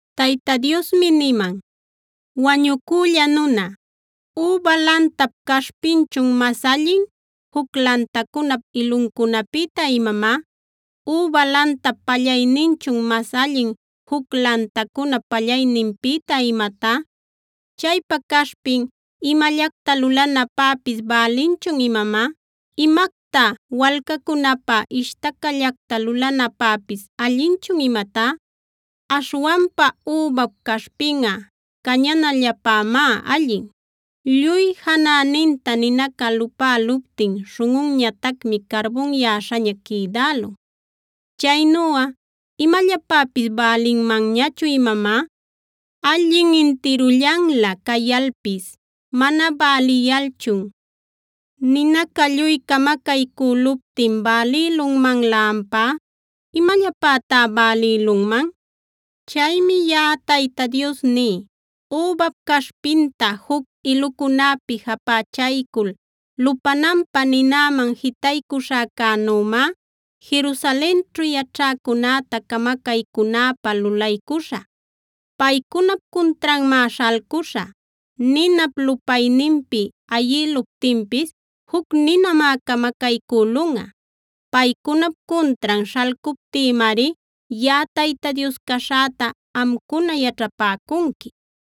Tayta Diosmi niman: “Wañucülla nuna, ¿üba lantap caśhpinchun mas allin juc lantacunap iluncunapïta imamá? ¿Üba lantap pallayninchun mas allin juc lantacunap pallayninpïta imatá? ¿Chaypa caśhpin imallacta lulanapäpis bälinchun imamá? ¿Imacta walcacunapä ishtacallacta lulanapäpis allinchun imatá? Aśhwanpa übap caśhpinꞌa cañanallapämá allin. Lluy janäninta ninaca lupäluptin śhunꞌunñatacmi carbunyäśhaña quïdälun. Chaynuꞌa ¿imallapäpis bälinmanñachun imamá? Allin intirullanlä cayalpis mana bäliyalchun, ¿ninaca lluy camacaycüluptin bälïlunmanlä ampá? ¿Imallapätá bälïlunman? “Chaymi yaꞌa Tayta Dios ní: Übap caśhpinta juc ilucunäpi japächaycul lupananpä ninäman jitaycuśhäcänümá, Jerusalenćhu yaćhäcunäta camacaycünäpä lulaycuśhä. Paycunap cuntranmá śhalcuśhä. Ninap lupayninpi ayïluptinpis juc ninamá camacaycülunꞌa. Paycunap cuntran śhalcuptïmari yaꞌa Tayta Dios caśhäta amcuna yaćhapäcunqui.